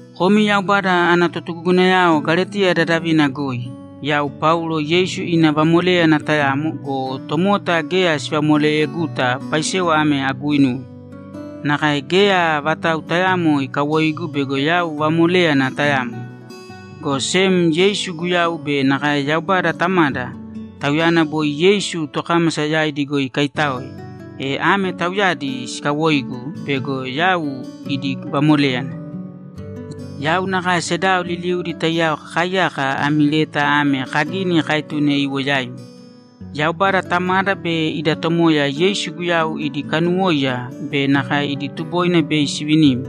Komi Yaubada ana totugugunayao Galetiya dadavina goi, Yau Paulo Yeisu ina vamoléyana tayamo go, tomota geya sivamoleyeguta paisewa ame aguuinuwe. Nakae geya vatau tayaamo ikawoigu bego yau vamoléyana tayamo, go sem Yeisu Guyau be nakae Yaubada Tamada, Tauyana boi Yeisu tokámasa yaidi goi ikaitáoe, e ame Tauyadi sikawoigu bego yau idi vamoléyana. Yau nakae sedao liliudi taiyao kakaaiyaka ami leta ame kagini kaetune iwo yaimi. Yaubada Tamada be ida Tomoya Yeisu Guyau idi kanuwóiya be nakae idi tuboina bei sivinimi.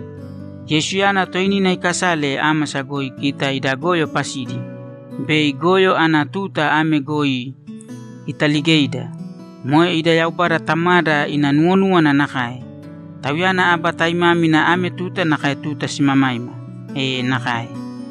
Yeisuyana toinina ikasale ámasa goi kita ida goyo pasidi bei goyo ana tuta ame goi italigeida. Moe ida Yaubada Tamada ina nuwonúwana nakae. Tauyana aba taimámina ame tuta nakae tuta simamaima! E nakae!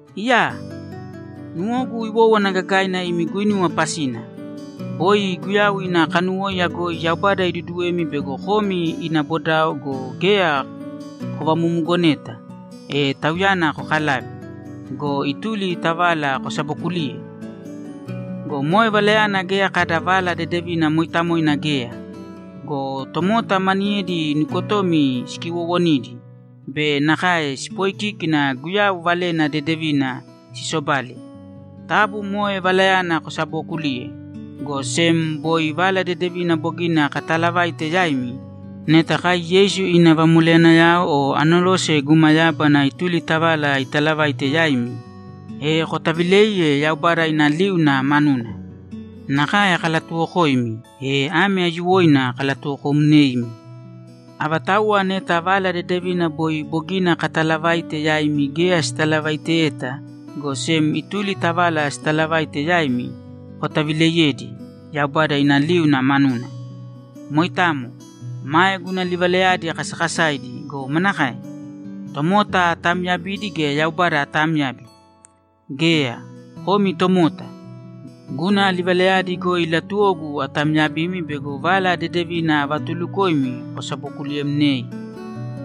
Iyaa! Nuwogu iwówana gagaina imi guinuwa pasina. Boi Guyau ina kanuwóiya goi Yaubada iduduwemi bego komi ina bodao go, geya kovamumugoneta, e Tauyana kokalave go, ituli ta vala kosabokuliye! Go moe valayana geya kada Vala Dedevina mooitamoina geya! Go tomota maniyedi nukotomi sikiwoowonidi be nakae sipooikíkina Guyau Valena Dedevina sisobale. Taabu moe valayana kosabookulīye, go sem boi Vala Dedevina bogina kataalavaite yaimi, neta kai Yeisu ina vamoleyanayao o anerose guma yábana ituli ta vala italavaite yaimi, e kotavilēiye Yaubada ina liuna manuna! Nakae kalatuwokoimi, e ame aiyuwoina kalatuwokomneimi: Avatauwa neta Vala Dedevina boi bogina kataalavaite yaimi geya sitalavaiteyeta, go sem ituli ta vala sitalavaite yaimi, kotavileiyēdi Yaubada ina liuna manuna! Moitamo. Mae guna livalayadi kasakasaidi go, manakae? Tomota ataamyabidi gea Yaubada aatamyabi? Geya, komi tomota! Guna livalayadi goi latuwogu atamyabimi bego Vala Dedevina avatuulukoimi kosabokuliyemnei.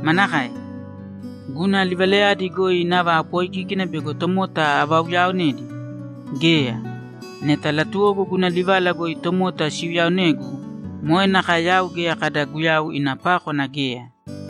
Manakae? Guna livalayadi goi nava apooikíkina bego tomota avauyaonedi? Geya! Neta latuwogu guna livala goi tomota siuyaonegu, moe nakae yau geya kada Guyau ina pákwana geya!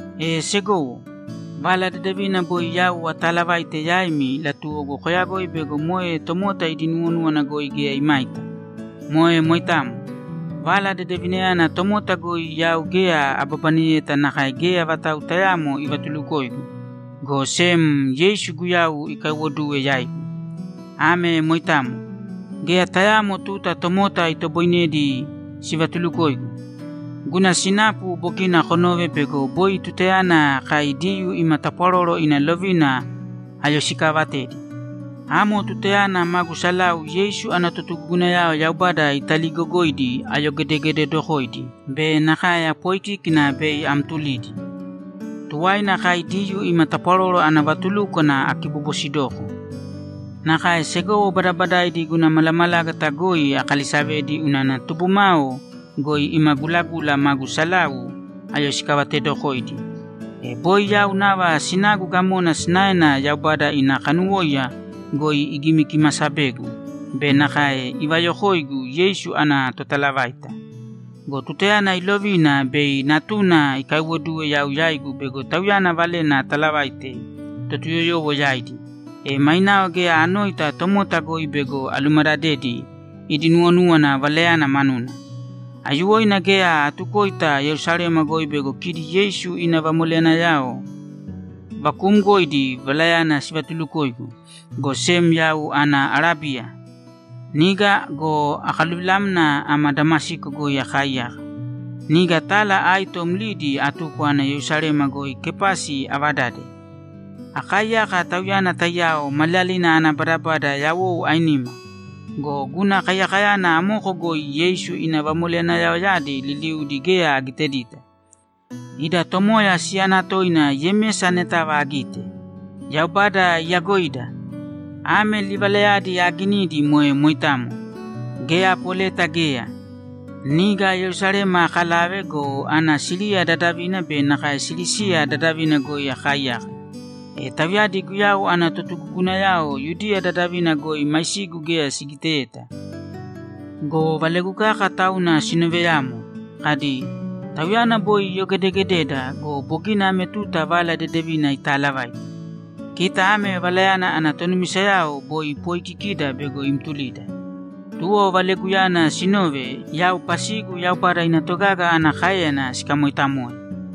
E segowo, Vala Dedevina boi yau ataalavaite yaimi latuwogu koyagoi bego moe tomota idi nuwonúwana goi geya imaita. Moe moitamo. Vala Dedevinayana tomota goi yau geya ababaneyeta nakae geya vatau tayaamo ivatulukoigu, go sem Yeisu Guyau ikaiwoduwe yaigu. Ame moitamo. Geya tayaamo tuta tomota itoboinedi sivatulukoigu. Guna sinapu bogina konove bego boi tutayana kai Diyuu ima tapwaroro ina lovina ayoisikaavatedi. Amo tutayana magu salau Yeisu ana totugugunayao Yaubada italiigogoidi ayogedegededokoidi be nakae apooikíkina bei amtulidi. Tuwaina, kai Diyuu ima tapwaroro ana vatulúkwana akibobosidoko. Nakae segowo badabadaidi guna malamalágata goi akalisavedi unana tubumao goi ima gulagula magu salau ayoisikavatedokoidi. E boi yau nava sinagu gamona sinaena Yaubada ina kanuwóiya goi igimikimasabegu be nakae ivayokoigu Yeisu ana totalavaita. Go tutayana ilovina bei Natuna ikaiwoduwe yau yaigu bego Tauyana Valena atalavaite Totuyoyowo yaidi, e mainao geya anoita tomota goi bego alumadadedi idi nuwonúwana Valayana manuna. Aiyuwoina geya atukoita Yerusalema goi bego kidi Yeisu ina vamoleyanayao vakuumgoidi Valayana sivatulukoigu, go sem yau ana Arábiya. Niga go, akaluvilamna ama Damasiko goi akaaiyaka. Niga tala aito mlidi atuko ana Yerusalema goi Kepasi avadade. Akaaiyaka tauyana taiyao maliyalina ana badabada yawou ainima. Go guna kaiyakayana amoko goi Yeisu ina vamoleyanayaoyadi liliudi geya agitedita. Ida Tomoya siyana toina Yemesa anetava agite. Yaubada iyagoida! Ame livalayadi aaginidi moe moitamo; geya apoleta geya! Niga Yerusalema akalave go, ana Siriya dadavina be nakae Silisiya dadavina goi akaaiyaka. E tauyadi Guyau ana totugugunayao Yudiya dadavina goi maisigu geya sigiteyeta go, valegu kaka tauna sinooveyamo, kadi, ‘Tauyana boi iyogedegededa go, bogina ame tuta Vala Dedevina itaalavaite. Kita ame Valayana ana tonumisayao boi ipoikikida bego imtulida.’ Tuwo valeguyana sinove, yau pasigu Yaubada ina togaga ana káeyana sikamoitamoe.